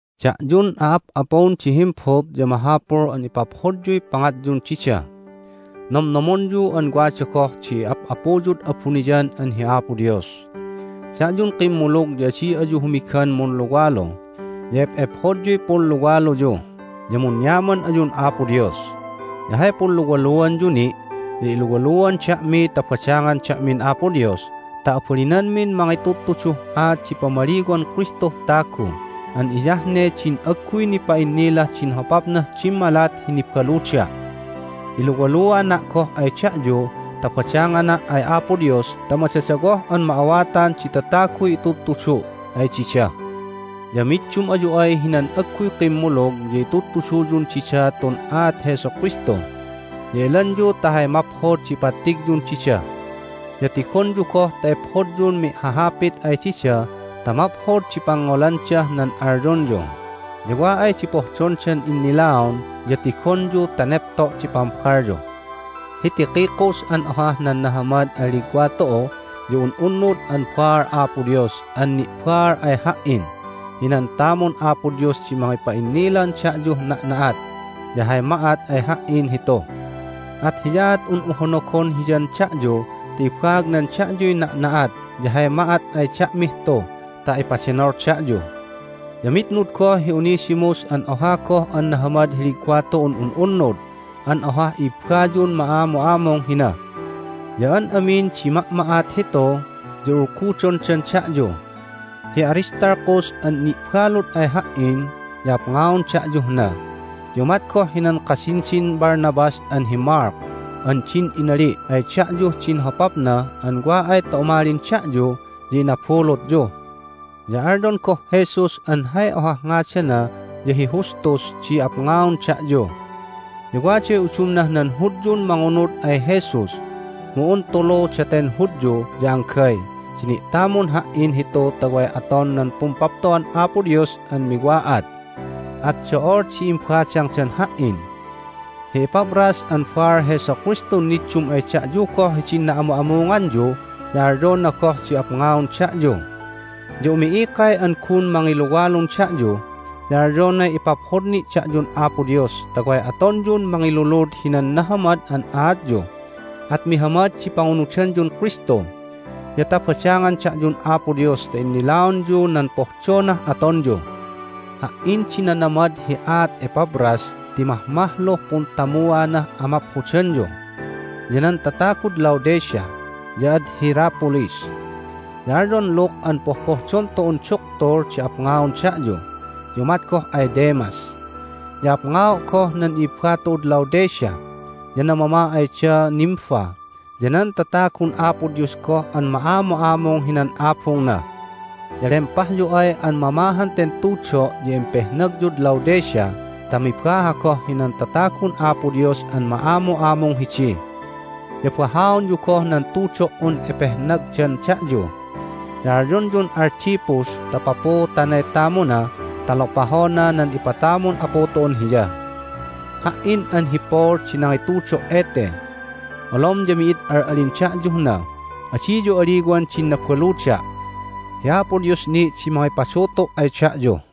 Da'yun a'ap'apun di himbut ya mahapul an ipaphodyuy pangatyun dida. Nomnomonyu an wada goh di Ap'apuyud abuniyan an hi Apo Dios. Da'yun kimmulug ya adi ayu humigan munluwalu, ya ep'ephodyuy punluwaluyu, ya munyaman ayun Apo Dios. Ya hay punluwaluanyu ni' ya iluwaluan da'mi ta badangan da'min Apo Dios ta abalinanmin mangitudtuduh aat di pamaliwan Kristuh tagu an hiyah ne din agguy nipa'innilah din hopapnah dimmalat hi nibaluda'. Iluwaluana' goh ay da'yu ta badangana' ay Apo Dios ta madadawoh an ma'awatan di tataguy itudtudu' ay dida. Ya middum ayu ay hinan agguy kimmulug ya itudtuduyun dida tun aat Jesu Kristu, ya elanyu ta hay maphod di ipattigyun dida. Ya tigonyu goh ta ephodyun mi'hahhahapit ay dida ta maphod di pangngolandah nan alyonyu. Ya wa ay di pohdondan innilaon ya tigonyu ta nepto' di pambalyu. Hi Tychicus an ohah nan nahamad an ligwa tu'u ya un'unnud an baal Apo Dios an ni'baal ay ha"in hinan tamun Apo Dios di mangipa'innilan da'yuh na'na'at ya hay ma'at ay ha"in hitu. At hiyaat un'u honogon hiyan da'yu ta ibaagnan da'yuy na'na'at ya hay ma'at ay da'mih tu ta ipadenol da'yu. Ya mitnud goh hi Onesimus an oha goh an nahamad hi ligwa tu'un un'unnud an ohah i'ibbayun ma'amu'amung hina. Ya an amin di ma'ma'at hitu ya ulgudondan da'yu. Hi Aristarchus an ni'balud ay ha"in ya apngaon da'yuh na, ya umat goh hinan kasinsin Barnabas an hi Mark an din inali' ay da'yuh din hopapna an wa ay ta umalin da'yu ya inabulutyu. Ya alyon goh Jesus (an hay ohah ngadana ya hi Justus) di apngaon da'yu. Ya waday udumnah nan Hudyun mangunud ay Jesus, mu un tulu daten Hudyu ya anggay di ni'tamun ha"in hitu ta way aton nan Pumpapto'an Apo Dios an miwa'at, at do'ol di imbadangdan ha"in. Hi Epaphras an baal Jesu Kristun niddum ay da'yu goh hidin na'amu'amunganyu ya alyona goh di apngaon da'yu. Ya umi'ikay an gun mangiluwalun da'yu, ya alyonay ipaphod ni' da'yun Apo Dios ta way atonyun mangilulud hinan nahamad an aatyu, at mihamad di pangunudanyun Kristu, ya ta badangan da'yun Apo Dios ta innilaonyu nan pohdonah atonyu. Ha"in di nanamad hi aat Epaphras ti mahmahluh puntamuanah amaphodanyu, ya nan tatagud Laodicea, ya ad Hierapolis. Ya alyon Luke an pohpohdon tu'un duktul di apngaon da'yu, ya umat goh ay Demas. Ya apngao' goh nan i'ibba tu'ud Laodicea, ya namama ay da Nympha ya nan tatagun Apo Dios goh an ma'amu'amung hinan abungna. Ya lempahyu ay an mamahan ten tudo' ya impehnagyud Laodicea ta mibaha goh hinan tatagun Apo Dios an ma'amu'amung hidi. Ya bahaonyu goh nan tudo"un epehnagdan da'yu. Ya alyonyun Archippus ta papuutanay tamuna ta lopahona nan ipatamun Apu tu'un hiya. Ha"in an hi Paul di nangitudo' ete: "Olom ya mi'id al'alin da'yuh na. Adiyu aliwan din nabaluda'. Hi Apo Dios ni' di mangipadutu' ay da'yu."